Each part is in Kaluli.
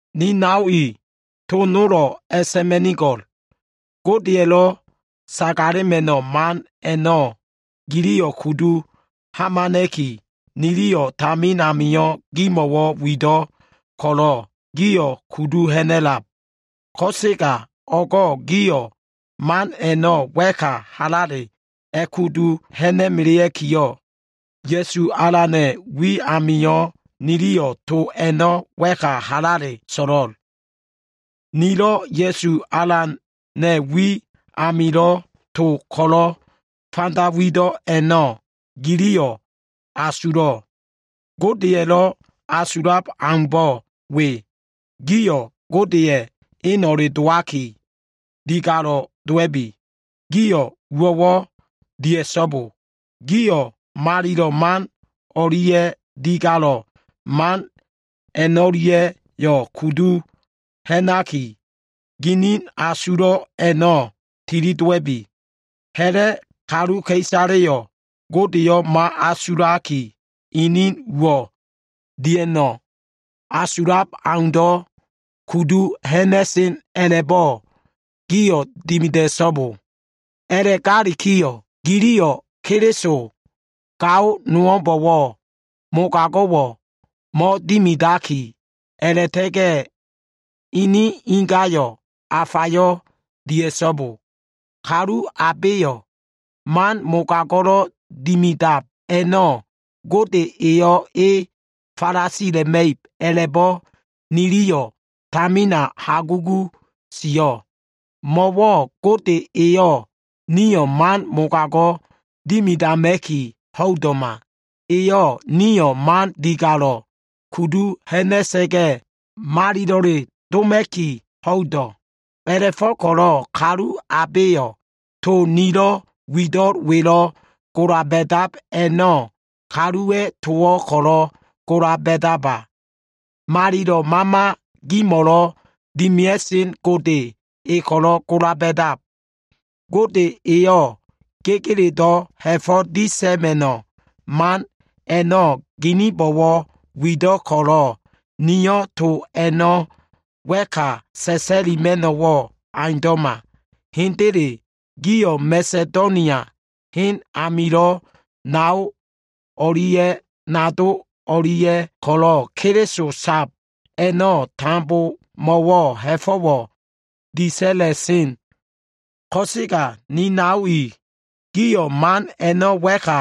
Ni nao i, to nolo꞉ a꞉sa꞉ma꞉nigo꞉l. Godelo꞉ sagalema꞉no꞉ man a꞉no꞉ giliyo꞉ kudu hamana꞉ki, niliyo꞉ tamin amio꞉ gimo꞉wo꞉ wido꞉ ko꞉lo꞉, gio꞉ kudu ha꞉na꞉lab. Ko꞉sega o꞉go꞉ gio꞉ man a꞉no꞉ wa꞉ka halale a꞉kudu ha꞉na꞉melea꞉ki, Ya꞉su Alana꞉ wi amio꞉ niliyo꞉ to a꞉no꞉ wa꞉ka halale so꞉lo꞉l. Nilo꞉ Ya꞉su Alana꞉ wi amilo꞉ to ko꞉lo꞉ fanda wido꞉ a꞉no꞉ giliyo꞉ asulo꞉. Godeya꞉lo꞉ asulab aumbo꞉ we. Gio꞉ Godeya꞉ eno꞉le dowaki, digalo꞉ dowa꞉bi. Gio꞉ uwo꞉wo꞉ dia꞉so꞉bo. Gio꞉ malilo꞉ man o꞉lia꞉ digalo꞉ man a꞉no꞉lia꞉yo꞉ kudu ha꞉naki, ginin asulo꞉ a꞉no꞉ tilidowa꞉bi. Ha꞉la꞉ kaluka꞉isaleya꞉lo꞉ Godeyo꞉ mo꞉asulaki, inido꞉ uwo꞉ dia꞉no꞉ asulab aundo꞉ kudu ha꞉na꞉sen o꞉leaumbo꞉ giliyo꞉ dimida꞉so꞉bo. A꞉la꞉gakiyo꞉, giliyo꞉ Keliso gao nowo꞉mbo꞉wo꞉ mogago꞉wo꞉ mo꞉dimidaki, a꞉la꞉ta꞉ga꞉ inin ingayo꞉ afa dia꞉so꞉bo. Kalu abeyo꞉ man mogago꞉lo꞉ dimidab a꞉no꞉ Gode eyo꞉ e falasila꞉ma꞉ib a꞉la꞉bo꞉ niliyo꞉ tamina hagugu sio꞉. Mo꞉wo꞉ Gode eyo꞉ nio꞉ man mogago꞉ dimidama꞉ki ho꞉ido꞉ma. Eyo꞉ nio꞉ man digalo꞉ kudu ha꞉na꞉sa꞉ga꞉, malilo꞉le doma꞉ki ho꞉ido꞉. A꞉la꞉fo꞉ko꞉lo꞉ kalu abeyo꞉ to nilo꞉ wido꞉l welo꞉ gola ba꞉dab a꞉no꞉, kaluwa꞉ towo꞉ ko꞉lo꞉ gola ba꞉daba. Malilo꞉ Mama gimo꞉lo꞉ dimia꞉sen Gode E ko꞉lo꞉ gola ba꞉dab. Gode eyo꞉ gegeledo꞉ ha꞉fo꞉ disa꞉ma꞉no꞉ man a꞉no꞉ gininbo꞉wo꞉ wido꞉ ko꞉lo꞉, nio꞉ to a꞉no꞉ wa꞉ka sa꞉sa꞉lima꞉no꞉wo꞉ aundo꞉ma. Hendele, gio꞉ Masedonia hen amilo꞉ nao o꞉lia꞉ nado o꞉lia꞉ ko꞉lo꞉ Keliso sab a꞉no꞉ tambomo꞉wo꞉ ha꞉fo꞉wo꞉ disa꞉la꞉sen. Ko꞉sega ni nao i, gio꞉ man a꞉no꞉ wa꞉ka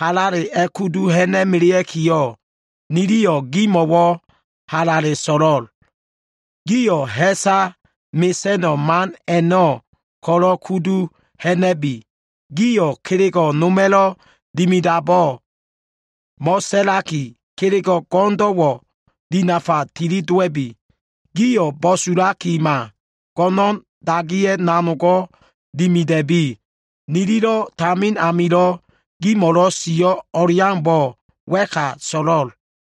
halale a꞉kudu ha꞉na꞉melea꞉kiyo꞉, niliyo꞉ gimo꞉wo꞉ halale so꞉lo꞉l. Gio꞉ ha꞉salo꞉ mesa꞉no꞉ man a꞉no꞉ ko꞉lo꞉ kudu ha꞉na꞉bi. Gio꞉ kelego꞉ noma꞉lo꞉ dimidabo꞉ mo꞉sa꞉laki, kelego꞉ go꞉no꞉ndo꞉wo꞉ dinafa tilidowa꞉bi. Gio꞉ bo꞉sulakima, go꞉no꞉n dagiya꞉ nanogo꞉ dimida꞉bi. Nililo꞉ tamin amilo꞉ gimo꞉lo꞉ sio꞉ o꞉leaumbo꞉ wa꞉ka a꞉so꞉lo꞉l.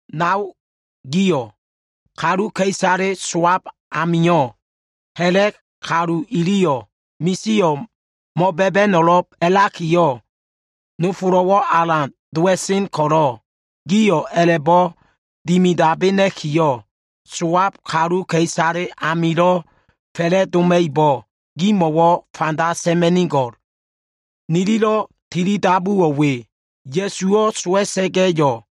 Nao gio꞉, kaluka꞉isale sowab amio꞉, ha꞉la꞉ kalu iliyo꞉ misio꞉ mo꞉ba꞉ba꞉no꞉lo꞉b a꞉lakiyo꞉ nofolo꞉wo꞉ alan dowa꞉sen ko꞉lo꞉, gio꞉ a꞉la꞉bo꞉ dimidabena꞉kiyo꞉, sowab kaluka꞉isale amilo꞉ fa꞉la꞉doma꞉ibo꞉, gimo꞉wo꞉ fanda sa꞉ma꞉nigo꞉l. Nililo꞉ tilidabuwo꞉ we. Ya꞉suwo꞉ sowa꞉sa꞉ga꞉yo꞉,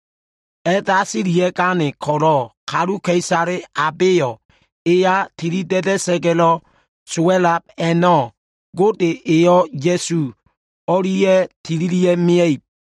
a꞉dasilia꞉gane ko꞉lo꞉, kaluka꞉isale abeyo꞉ eya tilida꞉da꞉sa꞉ga꞉lo꞉ sowa꞉lab a꞉no꞉, Gode eyo꞉ Ya꞉su o꞉lia꞉ tililia꞉ mia꞉ib.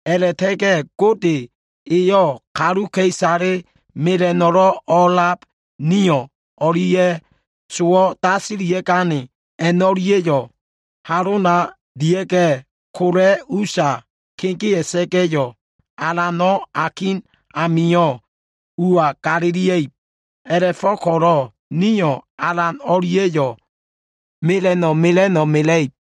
A꞉la꞉ta꞉ga꞉yo꞉ Gode eyo꞉ kaluka꞉isale mela꞉no꞉lo꞉ o꞉lab nio꞉lo꞉ dia꞉ga꞉, ni o꞉lia꞉ sowo꞉ dasilia꞉gane a꞉no꞉lia꞉yo꞉ kola꞉ usa kegea꞉sa꞉ga꞉, Alano꞉ akin amio꞉ ua galilia꞉ib. A꞉la꞉go꞉ko꞉lo꞉ nio꞉ Alan o꞉lia꞉yo꞉ mela꞉no꞉ mela꞉no꞉ mela꞉ib.